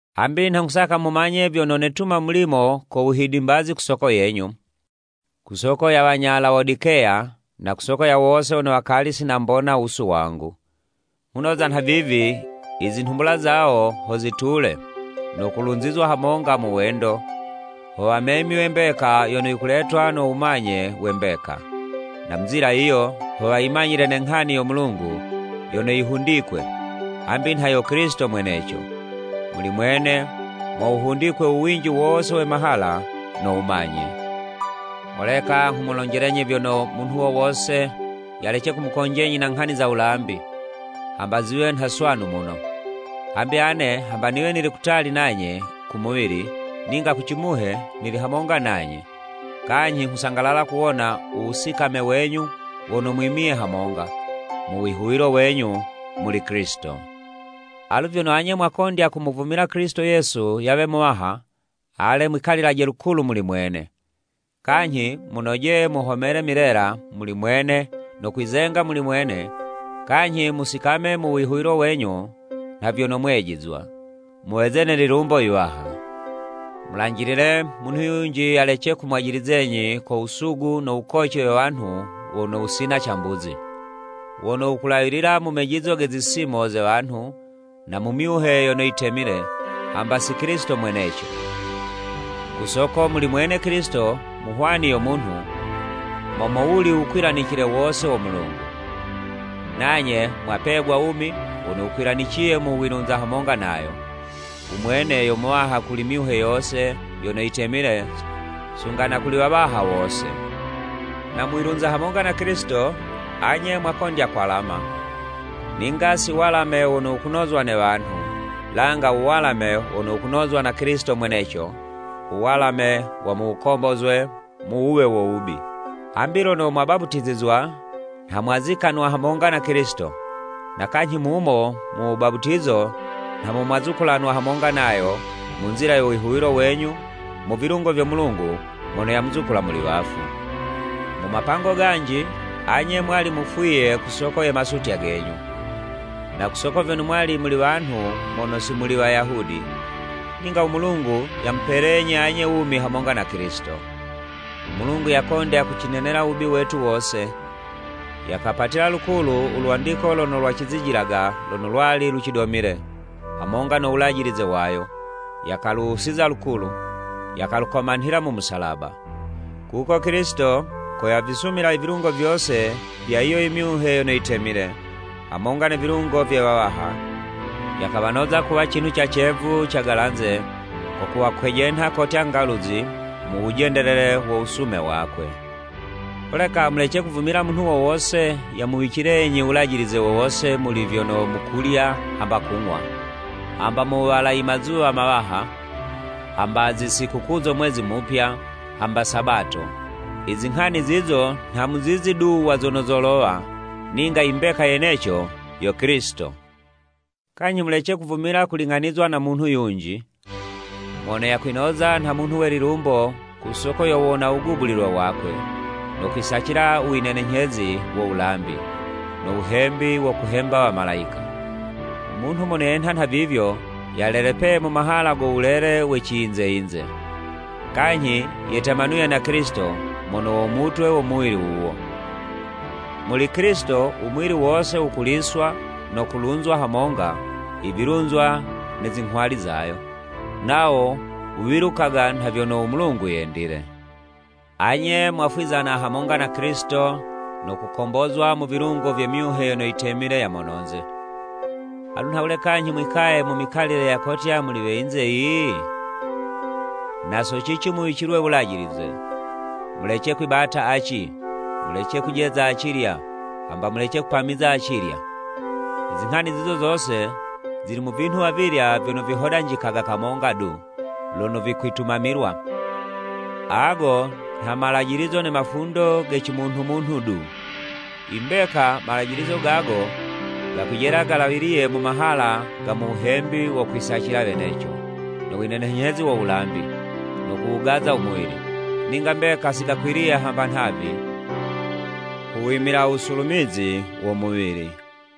Hambi nha nghusaka mumanye vyono netuma mulimo ko wuhidimbazi ku soko yenyu, ku soko ya wanya Lawodikeya, na ku soko ya wose wono wakali si nambona wusu wangu. Nghunoza nhavivi, i zinhumbula zawo ho zitule, no kulunzizwa hamonga mu wendo, ho wamemywe mbeka yono yikuletwa no wumanye we mbeka. Na mu nzila yiyo, ho woyimanyila ne nghani yo Mulungu yono yihundikwe, hambi nha yo Kilisito mweneco. Muli mwene mo wuhundikwe u winji wose we mahala no wumanye. Holeka nghumulonjelenyi vyono, munhu wo wose yalece kumukonjenyi na nghani za wulambi, hamba ziwe nha swanu muno. Hambi ane hamba niwe nili kutali nanye ku muwili, ninga ku cimuhe nili hamonga nanye, kanyhi nghusangalala kuwona u wusikame wenyu wono mwimiye hamonga, mu wihuwilo wenyu muli Kilisito. Alu vyono anye mwakondya kumuvumila Kilisito Yesu yawe Muwaha, ale mwikalilaje lukulu muli mwene. Kanyhi munojeye muhomele milela muli mwene no kwizenga muli mwene kanyhi musikame mu wihuwilo wenyu nha vyono mwejizwa. Muweze ne lilumbo iwaha. Mulanjilile, munhu yunji yalece kumwajilizenyi ko wusugu no wukoci we wanhu wono wusina cambuzi, wono wukulawilila mu mejizo ge zisimo ze wanhu, na mu myuhe yono yitemile, hamba si Kilisito mweneco! Ku soko muli mwene Kilisito mu hwani yo munhu, mo mowuli wukwilanicile wose wo Mulungu. Nanye mwapegwa wumi wono wukwilaniciye mu wilunza hamonga nayo. U Mwene yo Muwaha kuli myuhe yose yono yitemile sunga na kuli wawaha wose. Na mu wilunza hamonga na Kilisito, anye mwakondya kwalama, ninga si walame wono wukunozwa ne wanhu, langa u walame wono wukunozwa na Kilisito mweneco, u walame wa mu wukombozwe mu wuwe wo wubi. Hambi lono mwabaputizizwa, nha mwazikanwa hamonga na Kilisito, na kanyhi mumo mu wubaputizo nha mwazukulanwa hamonga nayo mu nzila yo wihuwilo wenyu mu vilungo vyo Mulungu mono yamuzukula muli wafu. Mu mapango ganji, anye mwali mufwiye ku soko ye masutya genyu, na ku soko vyono mwali muli wanhu mono si muli Wayahudi. Ninga u Mulungu yamupelenyi anye wumi hamonga na Kilisito. U Mulungu yakondya kucinenela u wubi wetu wose, yakapatila lukulu u lwandiko lono lwacizijilaga lono lwali lucidomile, hamonga no wulajilize wayo, yakaluwusiza lukulu, yakalukomanhila mu musalaba. Kuko Kilisito, ko yavisumila i vilungo vyose vya yiyo i myuhe yono yitemile, hamonga ne vilungo vye wawaha, yakawanoza kuwa cinhu ca cevu, cagalanze, ko kuwakwejenha kotya ngaluzi mu wujendelele wo wusume wakwe. Holeka mulece kuvumila munhu wo wose yamuwicilenyi wulajilize wo wose muli vyono mukulya hamba kung'wa, hamba mu wuwala i mazuwa mawaha, hamba zi sikukuu zo mwezi mupya, hamba Sabato. I zinghani zizo nha muzizi du wa zono zolowa, ninga i mbeka yeneco, yo Kilisito. Kanyhi mulece kuvumila kuling'anizwa na munhu yunji, mono yakwinoza nha munhu we lilumbo ku soko yo wuwona wugubulilwe wakwe, no kwisacila u winenenyhezi wo wulambi, no wuhembi wo kuhemba wamalayika. U munhu mono yenha nhavivyo yalelepeye mu mahala go wulele ge ciyinze yinze. Kanyhi yetemanuye na Kilisito mono wo mutwe wo muwili wuwo. Muli Kilisito, u muwili wose wukuliswa no kulunzwa hamonga i vilunzwa ne zinghwali zayo, nawo wuwilukaga nha vyono u Mulungu yendile. Anye mwafwizana hamonga na Kilisito no kukombozwa mu vilungo vye myuhe yono yitemile ya mononze. Alu nhawule kanyhi mwikaye mu mikalile ya kotya muli we yinze yiyi? Na so cici muwicilwe wulajilize, “Mulece kwibata aci! Mulece kujeza acilya, hamba Mulece kupamiza acilya!” I zinghani zizo zose zili mu vinhu avilya vyono vihodanjikaga kamonga du lono vikwitumamilwa, ago nha malajilizo ne mafundo ge ci munhu munhu du. I mbeka, malajilizo gago gakwijela galawiliye mu mahala ga mu wuhembi wo kwisacila weneco, no winenenyhezi wo wulambi, no kuwugaza u muwili, ninga mbeka si gakwiliye hamba nhavi ku wimila u wusulumizi wo muwili.